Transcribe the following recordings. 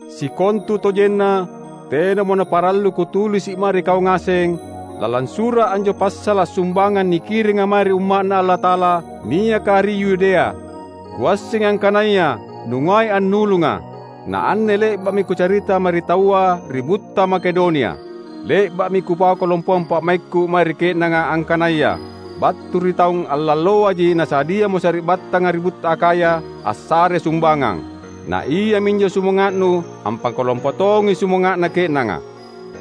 Sikontutojenna tenamo naparallu kutulisi’ mae ri kau ngaseng lalang sura’ anjo passala’ sumbangang nikiringa mae ri Umma’Na Allata’ala niaka ri Yudea. Kuassengi angkanaya nungai annulunga; na anne le’ba’mi kucarita mae ri taua ri butta Makedonia. Le’ba’mi kupau kalompoang pa’maikku mae ri ke’nanga angkanaya battu ri taung allaloaji nasadiamo sari’battanga ri butta Akhaya assare sumbangang. Na iaminjo sumanga’nu ampakalompo tongi sumanga’na ke’nanga.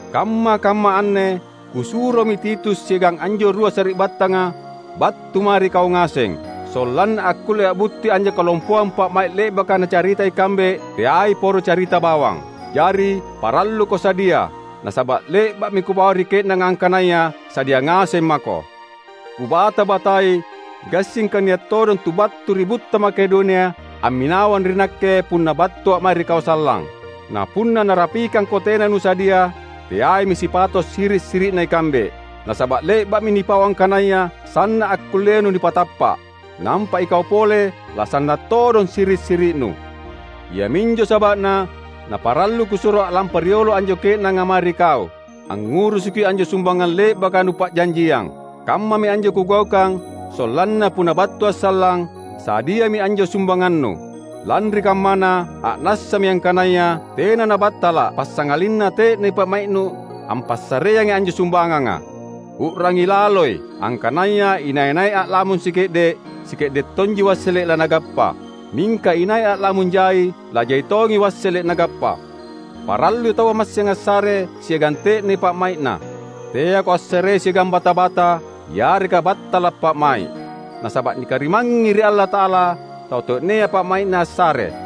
Kamma-kamma anne kusuromi Titus siagang anjo rua sari’battanga battu mae ri kau ngaseng. Sollanna akkulle a’butti anjo kalompoang pa’mai’ le’baka nacarita ikambe teai poro carita bawang. Jari, paralluko sadia, nasaba’ le’ba’mi kupau ri ke’nanga angkanaya sadia ngaseng mako. Kubata-batai gassingka nia’ todong tu battu ri butta Makedonia amminawang ri nakke punna battua’ mae ri kau sallang. Na punna narapikangko tena nusadia, teaimi sipato’ siri’-siri’na ikambe. Nasaba’ le’ba’mi nipau angkanaya sanna’ akkullenu nipatappa’! Nampa ikau pole lasanna’ todong siri’-siri’nu. Iaminjo saba’na naparallu kusuro a’lampa riolo anjo ke’nanga mae ri kau, angngurusuki anjo sumbangang le’baka nupa’janjiang. Kammami anjo kugaukang sollanna punna battua’ sallang, sadiami anjo sumbangannu. Lanri kammana, a’nassami angkanaya tena nabattala’ passangalinna te’nei pa’mai’nu ampassareangi anjo sumbanganga. U’rangi laloi! Angkanaya inai-nai a’lamung sike’de’, sike’de’ tonji wassele’ lanagappa. Mingka inai a’lamung jai, lajai tongi wassele’ nagappa. Parallui taua massing assare siagang te’ne pa’mai’na. Teako assarei siagang bata-bata yareka battala’ pa’mai’. Nasaba’ nikarimangngi ri Allata’ala tau te’nea pa’mai’na assare.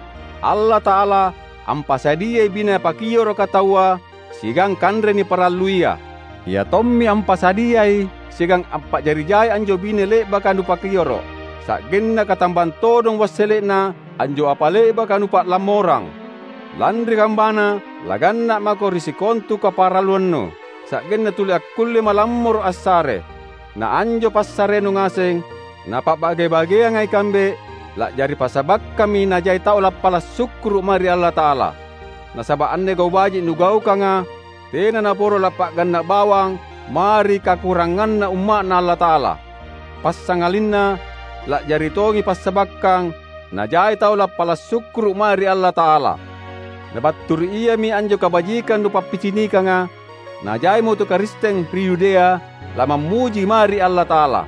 Allata’ala ampasadiai bine napakioroka taua siagang kanre niparalluia. Ia tommi ampasadiai siagang ampa’jari jai anjo bine le’baka nupakioro’, sa’genna katambang todong wassele’na anjo apa le’baka nupa’lammorang. Lanri kammana, laganna’ mako ri sikontu kaparalluannu, sa’gennu tuli akkulle malammoro’ assare. Na anjo passarenu ngaseng, napa’bage-bageanga ikambe, la’jari passabakkammi najai tau lappala’ sukkuru’ mae ri Allata’ala. Nasaba’ anne gau’ baji’ nugaukanga, tena naporo lappa’ganna’ bawang mae ri kakuranganna Umma’Na Allata’ala. Passangalinna la’jari tongi passabakkang najai tau lappala’ sukkuru’ mae ri Allata’ala. Na battu ri iami anjo kabajikang nupappicinikanga, najaimo tu Karisteng ri Yudea lamammuji mae ri Allata’ala.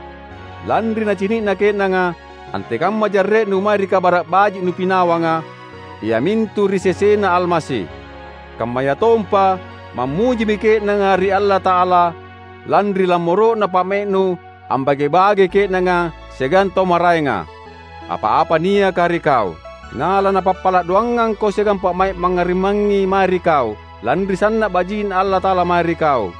Lanri nacini’na ke’nanga antekamma jarre’nu mae ri Kabara’ Baji’ nupinawanga, iamintu ri sesena Almasi. Kammayatompa mammujimi ke’nanga ri Allata’ala lanri lammoro’na pa’mai’nu ambage-bagei ke’nanga siagang tau maraenga, apa-apa niaka ri kau. Na lanapappala’ doangangko siagang pa’mai’ mangngarimangngi mae ri kau, lanri sanna’ baji’Na Allata’ala mae ri kau.